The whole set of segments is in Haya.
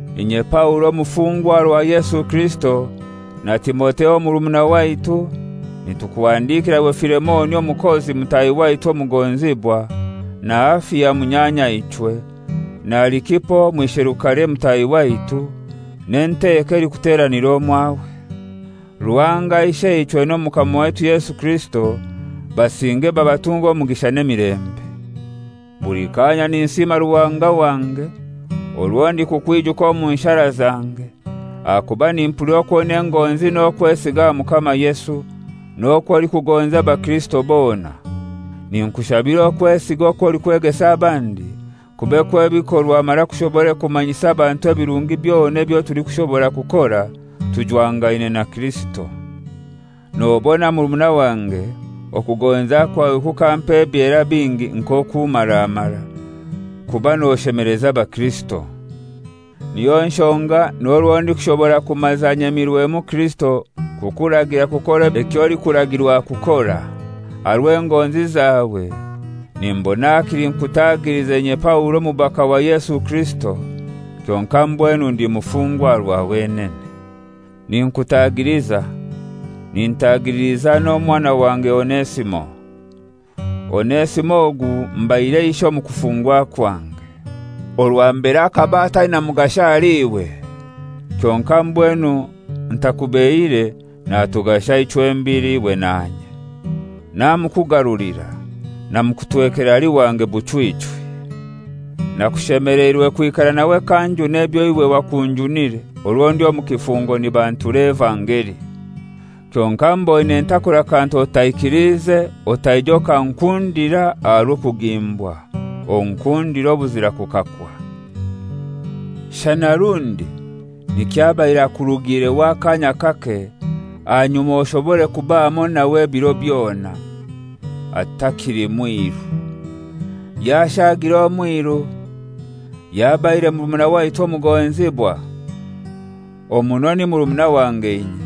Inye Paulo, omufungwa aha rwa Yesu Kirisito, na Timotheo murumuna waitu, nitukuhandikira iwe Filemoni omukozi mutahi waitu omugonzibwa, na Afia munyanyaichwe, na Arikipo omwisherukare mutahi waitu, n'enteko elikuteranira omwawe. Ruhanga Isheichwe n'Omukama waitu Yesu Kirisito basinge babatunge omugisha n'emilembe. Buli kaanya ninsiima Ruhanga wange orwo ndikukwijuka omu nshara zange, ahakuba nimpulira okwo oina engonzi n'okwesiga aha Mukama Yesu, n'okwo olikugonza abakirisito bona. Ninkushabira okwesiga okw'olikwegesa abandi kube kw'ebikorwa mara kushobore kumanyisa abantu ebirungi byona ebyo tulikushobora kukora tujwangaine na Kirisito. Nobona murumuna wange okugonza kwawe kukampa ebyera bingi nk'okummaramara, kuba noshemeleza abakirisito. Niyo nshonga n'orwo ndikushobora kumaza nyemirwemu Kirisito kukuragira kukora eky'olikuragirwa kukora, aha rw'engonzi zawe nimbona hakili nkutagilize, inye Paulo omubaka wa Yesu Kirisito, kyonkai mbwenu ndi mufungwa aha rwa wenene. Ninkutagiliza, nintagililiza omwana wange Onesimo. Onesimo ogu mbaire ishe omu kufungwa kwange. (Orwa mbere akaba ataina mugasho ahali iwe, kyonkai mbwenu ntakubeihire natugasha ichwembili, iwe nanye). Namukugarulira, namukutwekera ali wange buchwichwi. Nakushemeleirwe kwikara nawe k'anjuna ebyo iwe wakunjunire orwo ndi omu kifungo nibantura evangeli. Kyonkai mboine ntakora kantu otaikiliize otaija okankundira aha rw'okugimbwa, onkundire obuzira kukakwa. Shana rundi nikyo abaire akurugiireho akaanya kake ahanyuma oshobore kuba hamoi nawe ebiro byona, atakili mwiru: Yashaagire omwiru, yabaire murumuna waitu omugonzibwa. Omuno ni murumuna wange inye,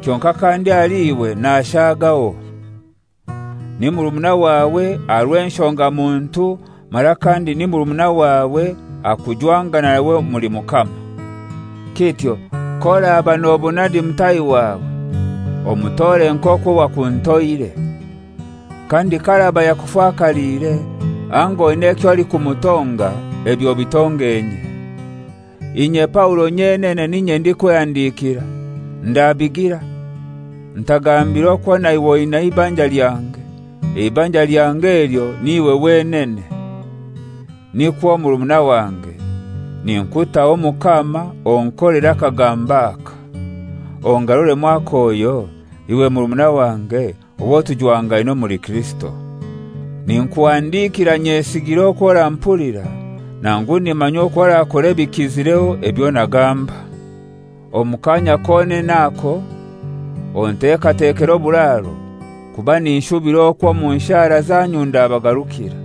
kyonkai kandi ahali iwe nashaagaho: Ni murumuna wawe aha rw'enshoga muntu mara kandi ni murumuna wawe aha kujwangana nawe omuli Mukama. Kityo k'oraba nobona ndi mutaahi wawe, omutore nk'okwo wakuntoire. Kandi k'araba yakufakaliire, anga oina eky'olikumutonga, ebyo obitonge inye. Inye Paulo nyenene n'inye ndikwehandikira, ndabigira, ntagambire okwo naiwe oina eibanja lyange, eibanja lyange elyo n'iwe wenene. Nikwo, murumuna wange, ninkutaho Mukama onkolere akagambo aka. Ongaruremu akoyo, iwe murumuna wange owo tujwangaine omuli Kirisito. Ninkuhandikira nyesigire okw'orampulira, nangu nimanya okw'orakora ebikizireho ebyo nagamba. Omu kaanya konene ako ontekatekere oburaaro, kuba ninshubira okwo omu nshara zanyu ndabagarukira.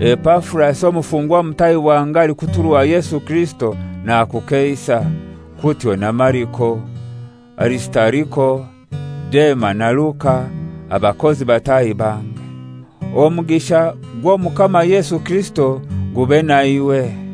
Epafurasi, omufungwa mutahi wange alikuturwa Yesu Kirisito, nakukeisa, kutyo na Mariko, Arisitariko, Dema na Luka, abakozi bataahi bange. Omugisha gw'Omukama Yesu Kirisito gube naiwe.